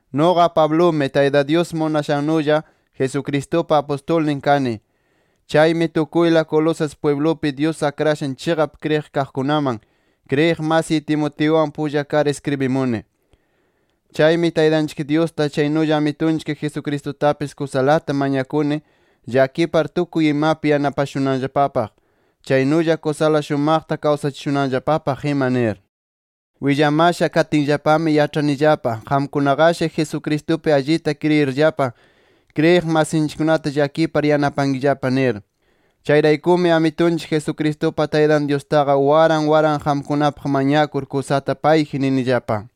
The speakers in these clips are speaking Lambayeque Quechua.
Nuqa Pablumi, Tayta Dyus munashannulla Jesucristupa apustulnin kani. Chaymi tukuyla Colosas pwiblupi, Dyus akrashan chiqap kriyiq kaqkunaman, kriyiq masiy Timoteuwan pulla kar iskribimuni. Chaymi Taytanchik Dyusta, chaynulla Amitunchik Jesucristutapis kusalata mañakuni llakipar tukuy imapi yanapashunanllapapaq, chaynulla kusala shumaqta kawsachishunanllapapaq ima nir. Willamasha katinllapami, yaĉhanillapa qamkunaqashi Jesucristupi allita kriyirllapa, kriyiq masinchikkunata llakipar yanapankillapa nir. Chayraykumi Amitunchik Jesucristupa Taytan Dyustaqa, waran waran qamkunapaq mañakur, kusata payji ninillapa.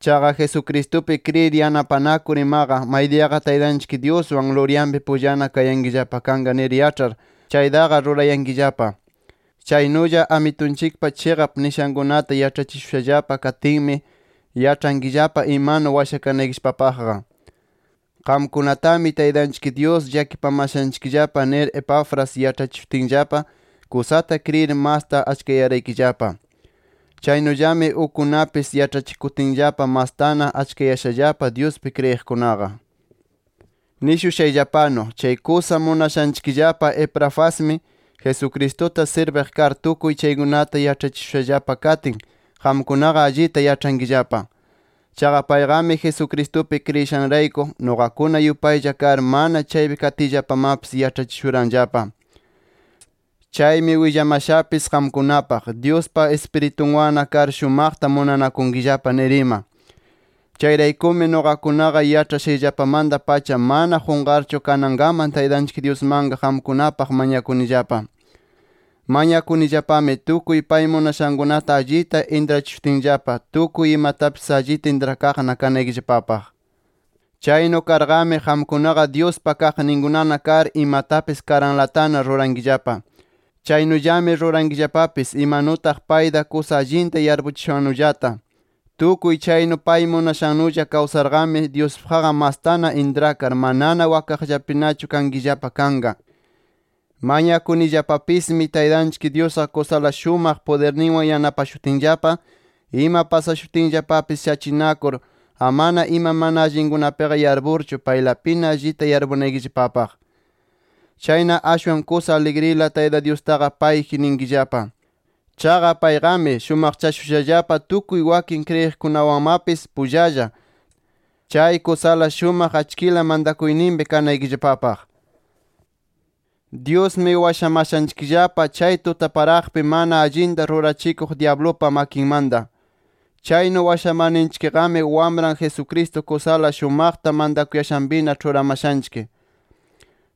Chaqa Jesucristupi kriyir yanapanakur imaqa, maydiyaqa Taytanchik Dyuswan luryanpi pullana kayankillapa kanqa nir yaĉhar, chaytaqa rurayankillapa. Chaynulla Amitunchikpa chiqap nishankunata yaĉhachishushallapa katinmi, yaĉhankillapa imanu washakanaykillapapaqqa. Qamkunatami Taytanchik Dyus llakipamashanchikllapa nir Epafras yaĉhachishutinllapa kusata kriyir, masta achkayaraykillapa. Chaynullami ukkunapis yaĉhachikutinllapa, mastana achkayashallapa Dyuspi kriyiqkunaqa. Nishushayllapanu, chay kusa munashanchikllapa Epafrasmi, Jesucristuta sirbiq kar tukuy chaykunata yaĉhachishushallapa katin, qamkunaqa allita yaĉhankillapa. Chaqa payqami Jesucristupi kriyishanrayku, nuqakuna yupaylla kar, mana chaypi katiyllapamapis yaĉhachishuranllapa. Chaymi willamashapis qamkunapaq, Dyuspa Ispiritunwanna kar, shumaqta munanakunkillapa nir ima. Chayraykumi, nuqakunaqa yaĉhashayllapamanta-pacha mana qunqarchu, kanankaman Taytanchik Dyusmanqa qamkunapaq mañakunillapa. Mañakunillapami, tukuy pay munashankunata allita intrachishutinllapa, tukuy imatapis allita intrakaqna kanaykillapapaq. Chaynu karqami, qamkunaqa Dyuspa kaqninkunana kar imatapis karanlatana rurankillapa. Chaynullami rurankillapapis imanutaq payta kusa allinta yarpuchishannullata. Tukuy chaynu pay munashannulla kawsarqami, Dyuspaqqa mastana intrakar, manana wakaqllapinachu kankillapa kanqa. Mañakunillapapismi Taytanchik Dyusqa kusala shumaq pudirninwan yanapashutinllapa, ima pasashutinllapapis shachinakur, amana ima mana allinkunapiqa yarpurchu, paylapina allita yarpunaykillapapaq. Chayna ashwan kusa aligrila, Tayta Dyustaqa payji ninkillapa. Chaqa payqami, shumaqchashushallapa tukuy wakin kriyiqkunawanmapis pullalla, chay kusala shumaq achkila mantakuyninpi kanaykillapapaq. Dyusmi washamashanchikllapa chay tutaparaqpi mana allinta rurachikuq dyablupa makinmanta. Chaynu washamarninchikqami Wamran Jesucristo kusala shumaqta mantakuyashanpina ĉhuramashanchik.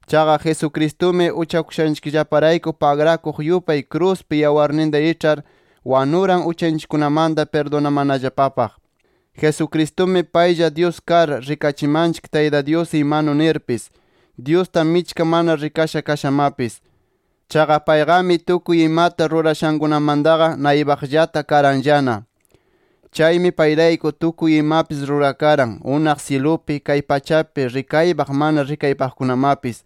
Chaqa Jesucristumi uchakushanchikllaparayku pagrakuq yupay, kruspi [yawarninta iĉhar] wanuran uchanchikkunamanta pirdunamanallapapaq. Jesucristumi paylla Dyus kar, rikachimanchik Tayta Dyus imanu nirpis, Dyusta michka mana rikasha kashamapis. Chaqa payqami tukuy imata rurashankunamantaqa naypaqllata karanllana. Chaymi payrayku, tukuy imapis rurakaran, unaq syilupi, kay pachapi rikaypaq mana rikaypaqkunamapis,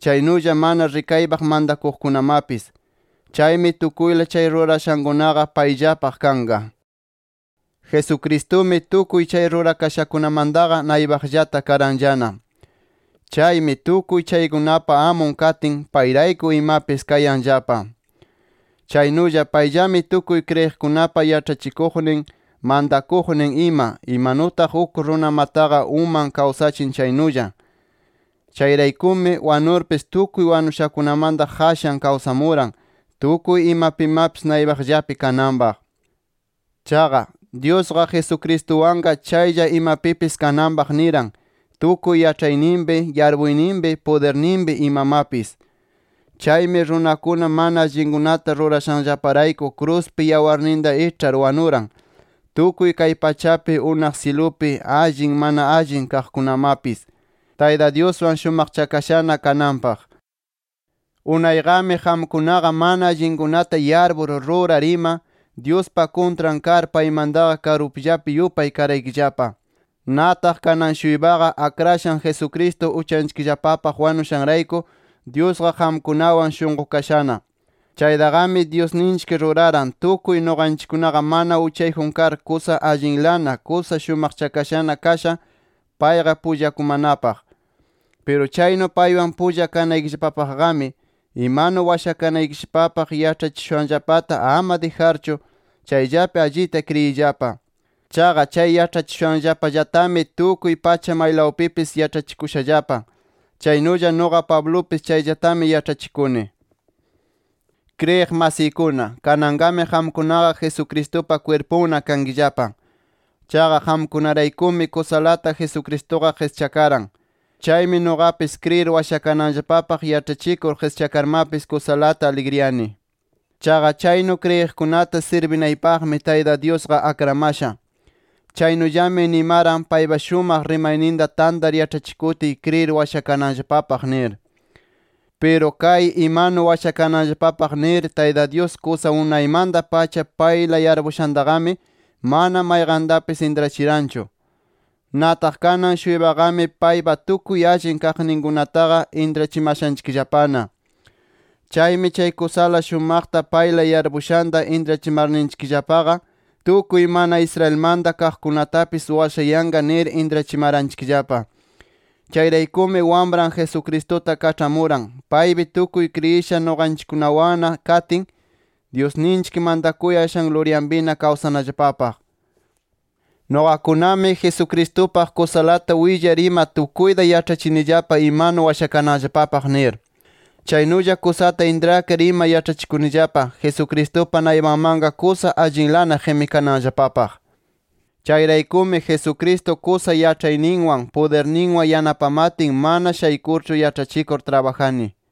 chaynulla mana rikaypaq mantakuqkunamapis. Chaymi tukuyla chay rurakashakunaqa payllapaq kanqa. Jesucristumi, tukuy chay rurakashakunamantaqa naypaqllata karanllana. Chaymi, tukuy chaykunapa amun katin, payrayku imapis kayanllapa. Chaynulla, payllami tukuy kriyiqkunapa yaĉhachikuqnin, mantakuqnin ima, imanutaq uk runamataqa, uman kawsachin chaynulla. Chayraykumi, wanurpis tukuy wanushakunamanta qashan kawsamuran, tukuy imapimapis naypaqllapi kananpaq. Chaqa, Dyusqa Jesucristuwanqa chaylla imapipis kananpaq niran, tukuy yaĉhayninpi, yarpuyninpi, pudirninpi imamapis. Chaymi runakuna mana allinkunata rurashanllaparayku kruspi yawarninta iĉhar wanuran, tukuy kay pachapi, unaq syilupi, allin mana allin kaqkunamapis, Tayta Dyuswan shumaqchakashana kananpaq. Unayqami qamkunaqa mana allinkunata yarpur rurar ima, Dyuspa kuntran kar paymantaqa karupllapi yupay karaykillapa. Nataq kanan-shuypaqa, Akrashan Jesucristo uchanchikllapapaq wanushanrayku, Dyusqa qamkunawan shunqukashana. Chaytaqami Dyusninchik ruraran, tukuy nuqanchikkunaqa mana uchayjun kar kusa allinlana, kusa shumaqchakashana kasha, payqa pullakumanapaq. Piru chaynu paywan pulla kanaykillapapaqqami, imanu washakanaykillapapaq yaĉhachishushanllapata ama dijarchu, chayllapi allita kriyiyllapa. Chaqa chay yaĉhachishushanllapallatami tukuy pacha maylawpipis yaĉhachikushallapa. Chaynulla nuqa Pablupis chayllatami yaĉhachikuni. Kriyiq masiykuna, kananqami qamkunaqa Jesucristupa kwirpunna kankillapa. Chaqa qamkunaraykumi kusalata Jesucristuqa qischakaran. Chaymi nuqapis kriyir washakananllapapaq yaĉhachikur qischakarmapis kusalata aligriyani. Chaqa chaynu kriyiqkunata sirbinaypaqmi Tayta Dyusqa akramasha. Chaynullami nimaran, paypa shumaq rimayninta tantar yaĉhachikutiy kriyir washakananllapapaq nir. Piru kay imanu washakananllapapaq nir, Tayta Dyus kusa unaymanta-pacha payla yarpushantaqami, mana mayqantapis intrachiranchu. Nataq kanan-shuypaqami paypa tukuy allin kaqninkunataqa intrachimashanchikllapana. Chaymi chay kusala shumaqta payla yarpushanta intrachimarninchikllapaqa, tukuy mana Israelmanta kaqkunatapis washayanqa nir intrachimaranchikllapa. Chayraykumi Wamran Jesucristuta kaĉhamuran, paypi tukuy kriyisha nuqanchikkunawanna katin, Dyusninchik mantakuyashan luryanpina kawsanallapapaq. Nuqakunami Jesucristupaq kusalata willar ima tukuyta yaĉhachinillapa imanu washakananllapapaq nir. Chaynulla kusata intrakar ima yaĉhachikunillapa Jesucristupa naypanmanqa kusa allinlana qimikananllapapaq. Chayraykumi Jesucristo kusa yaĉhayninwan, pudirninwan yanapamatin, mana shaykurchu yaĉhachikur trabajani.